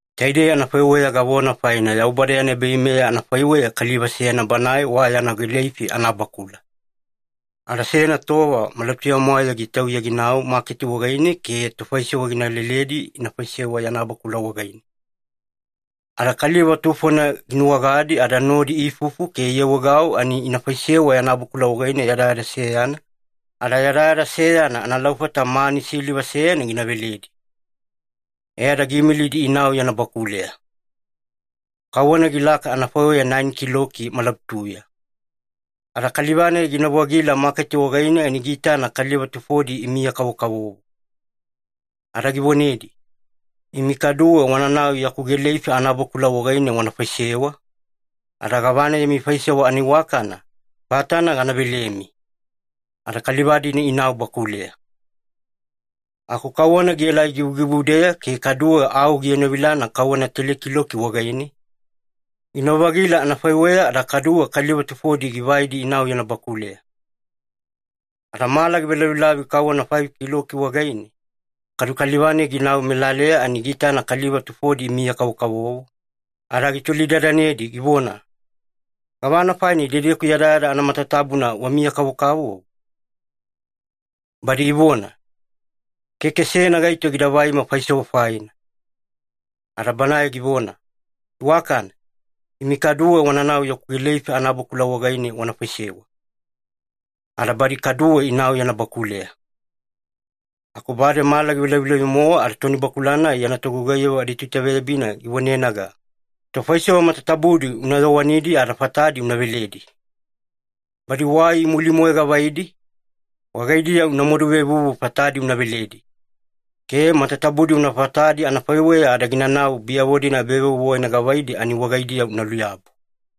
“Taidei anafaiweya gavona faina Yaubada yana ebaveimeya anafaiweya kaliva seyana banae wa yana gileifi anabakula. Ada seyana tova malabutuya-mwaeya gitauya ginau maketi wagaine ke tofaisewa gina leledi ina faisewa yana bakula wagaine. Ada kaliva tufona ginuwagadi ada nodi iifufu ke iawaegau ani ina faisewa yana bakula wagaine yadayada seyana, ada yadayada seyana analaufata mani siliva seyana gina veledi. E ada giimilidi inau yana bakuleya. Kauwana gilaka anafaiweya naeni kiloki malabutuya. Ada kaliva-nai ginau-vagila maketi wagaine ani giitana kaliva tufodi imiya-kavokavovo. Ada givonedi, ‘Imi kaduwe wananau yaku gileifi anabakula wagaine wana faisewa, ada gavana yami faisewa anaiwakana, fatana gana velemi.’ Ada kaliva-dina inau bakuleya. “Aku kauwana gielai givugivudeya ke kaduwe au gienovilana kauwana teli kiloki wagaine, ginau-vagila anafaiweya ada kaduwe kaliva tufodi givaidi inau yana bakuleya. Ada mala givelavilavi kauwana faifi kiloki wagaine, kadu kaliva-nai ginau melaleya ani giitana kaliva tufodi imiya-kavokavovo, ada gitolidadanedi givona, ‘Gavana faina idedeku yadayada anamatatabuna wamiya-kavokavovo?’ “Badi ivona, ‘Keke seyana gaito gida vaima faisewa faina.’ “Ada banae givona, ‘Iwakana, imi kaduwe wananau yaku gileifi anabakula wagaine wana faisewa.’ Ada badi kaduwe inau yana bakuleya. “Aku bade mala givelavilavi-mowa ada tonibakula-nai yana togugaiyavo aditoitaveyabina givonenaga, ‘Tofaisewa matatabudi una yowanidi ada fatadi una veledi. Badi wai imuli-moe gavaidi, wagaidiya una maduvevuvu fatadi una veledi, ke matatabudi una fatadi anafaiweya ada ginanau badiyavo ebavevuvu wagaine gavaidi ani wagaidiya una luyabu.’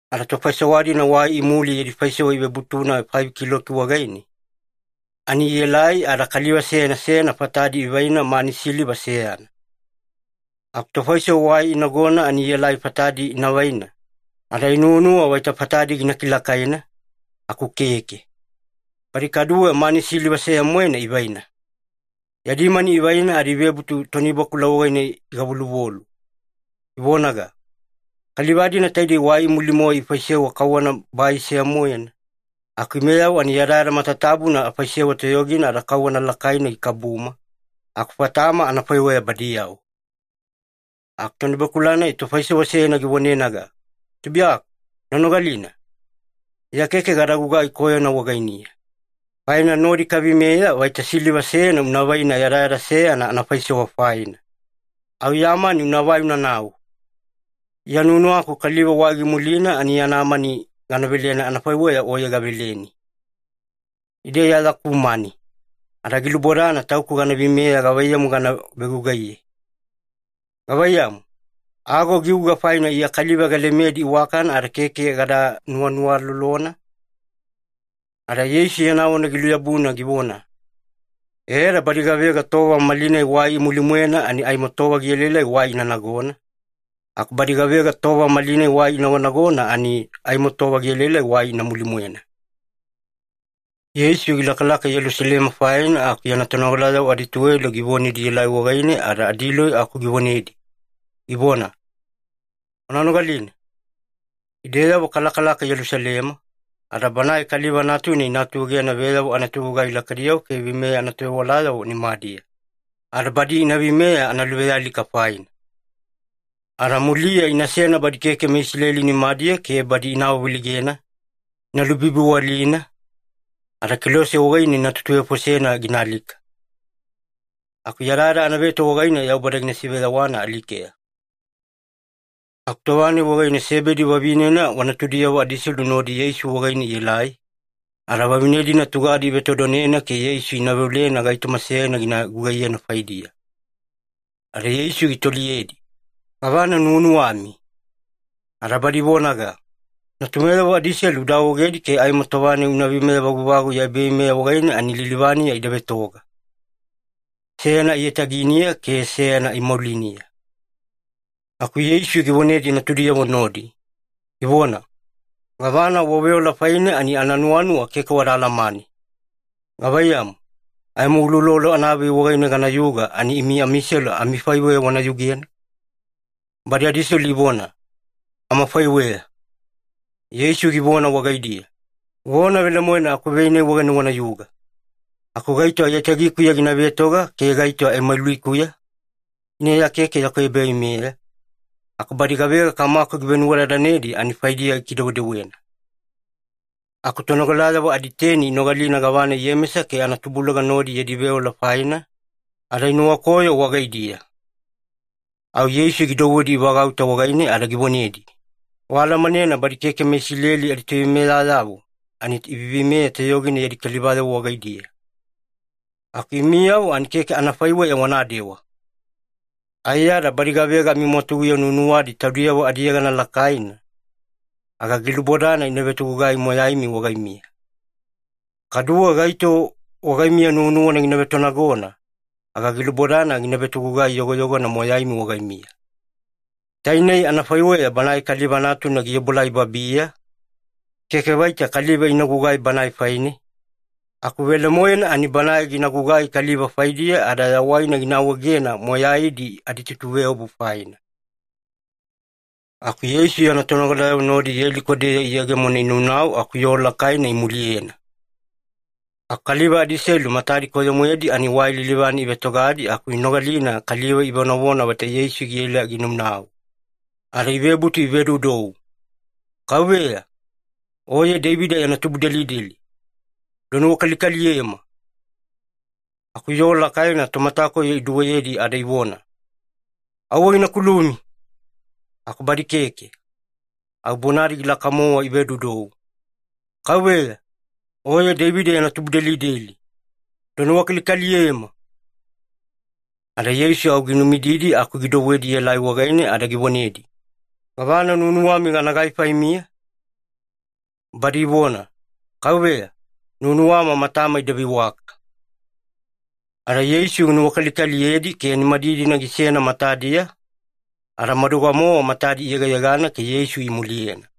“Ada tofaisewa-dina wai imuli yadi faisewa ivebutuna faifi kiloki wagaine, ani ielai ada kaliva seyana seyana fatadi ivaina mani siliva seyana. Aku tofaisewa wai inagona ani ielai fatadi ina vaina, ada inuwanuwa vaita fatadi gina kilakaina, aku keke. Badi kaduwe mani siliva seya-moena ivaina. Yadi mani ivaina ada ivebutu tonibakula wagaine igavoluvolu, ivonaga, ‘Kaliva-dina taidei wai imuli-moe ifaisewa kauwana bai seya-moena, aku imeyavo ani yadayada matatabuna afaisewa toyogina ada kauwana lakaina gikabuma, aku fatama anafaiweya badiyavo.’ “Aku tonibakula-nai tofaisewa seyana givonenaga, ‘Tubuiyaku, una nogalina. Iya keke gada gugai koyona wagainiya, faina nodi kaveimeya vaita siliva seyana una vaina yadayada seyana anafaisewa faina. Au ya mani unavai unanau. Iya nuwanuwaku kaliva wai gimulina ani yana mani gana velena anafaiweya oye gaveleni. Ida Iya yaku mani, ada gilubodana tauku gana veimeya gavaiyamu gana vegugaiye. Gavaiyamu, ago giuga faina Iya kaliva galemedi iwakana ada keke gada nuwanuwalolona?’” Ada Yeisu yana vona giluyabuna givona, “E ada badi gavega tova malinai wai imuline-mwena ani aimo tova gielaelai wai ina nagona, aku badi gavega tova malinai wai inagonagona ani aimo tova gielaelai wai ina muline-mwena.” Yeisu gilakalaka Yelusalema faina aku yana tonogalayavo adituwelo givonedi ielai wagaine ada adiloi aku givonedi, givona, “Wana nogalina. Ideyavo kalakalaka Yelusalema, ada Banae Kaliva Natuna ina atuegena veyavo anatovegugai lakaidiyavo ke veimeya anatovewalayavo nimadiya, ada badi ina veimeya analuvealika faina. Ada muliya inasena badi keke meIsileli nimadiya ke badi ina awaveleigena, ina lubibiwalina, ada kelose wagaine ina tutuvefosena gina alika. Aku yadayada anaveto wagaine Yaubada gina siveyawana alikeya.” Aku tova-nai wagaine Sebedi vavinena wa natudiyavo adiselu nodi Yeisu wagaine ielai, ada vavine-dina tugadi ivetodonena ke Yeisu ina veolena gaitoma seyana gina gugaiyena faidiya. Ada Yeisu gitoliyedi, “Gavana nuwanuwami?” Ada badi ivonaga, “Natumeyavo adiselu uda awaegedi ke aimo tova-nai una veimeya vaguvagu ya ebaveimeya wagaine, ani lilivaniya ida vetoga. Seyana aiyataginiya ke seyana aimauliniya.” Aku Yeisu givonedi natudiyavo nodi, givona, “Gavana waveola faine ani ananuwanuwa keke wada alamane. Gavaiyamu, aimo uloulolo anavei wagaine ganayuga ani imi amiselu amifaiweya wana yugena?” Badi adiselu ivona, “Amafaiweya.” Yeisu givona wagaidiya, “Vona velemoena akuvei-nai wagaine wanayuga. Aku gaito aiyatagikuya gina vetoga ke gaito aimaulikuya, ina Iya keke yaku ebaveimeya, aku badi gavega Kamaku givenuwadadanedi ani faidiya gikidewedewena.” Aku tonogalayavo aditeni inogalina gavana Iyemesa ke anatubuluga nodi yadi veola faina, ada inuwakoyo wagaidiya. Au Yeisu gidouwedi ivagauta wagaine ada givonedi, “Waalamanena badi keke meIsileli aditoveimeyayavo ani iveiveimeya toyogina yadi kalivayavo wagaidiya. Aku imiyavo ani keke anafaiweya wanadewa. Aiyada badi gavega amimwatuguya nuwanuwadi taudiyavo adiyegana lakaina, aga gilubodana ina vetogugai moyaimi wagaimiya. Kaduwe gaito wagaimiya nuwanuwana gina vetonagona, aga gilubodana gina vetogugai yogoyogona moyaimi wagaimiya. Tainei anafaiweya Banae Kaliva Natuna giobuelai babiya, keke vaita kaliva inagugai Banae faine, aku velemoena ani Banae gina gugai kaliva faidiya ada yawaina gina awaegena moyaidi aditutuveobu faina.” Aku Yeisu yana tonogalayavo nodi Yeliko-deya iyegemona inaunau aku yoo lakaina imuliyena. Aku kaliva adiselu matadi koyo-moedi, ani wai lilivane ivetogadi aku inogalina kaliva ivonavona vaita Yeisu giela ginaunau. Ada ivebutu ivedoudou, “Kauveya, Oye Deivida yana tubudelideli, uda nuwakalikaliyema!” Aku yoo lakaina tomatakoyo iduweyedi ada ivona, “Auwe gina kulumi!” Aku badi keke. Au bonadi gilaka-mowa ivedoudou, “Kauveya, Oye Deivida yana tubudelideli, uda nuwakalikaliyema!” Ada Yeisu au ginumididi aku gidouwedi ielai wagaine ada givonedi, “Gavana nuwanuwami ganagai faimiya?” Badi ivona, “Kauveya, nuwanuwama matama ida veiwaka.” Ada Yeisu ginuwakalikaliyedi ke nimadidina gisena matadiya, ada maduga-mowa matadi iyegeyegana ke Yeisu imuliyena.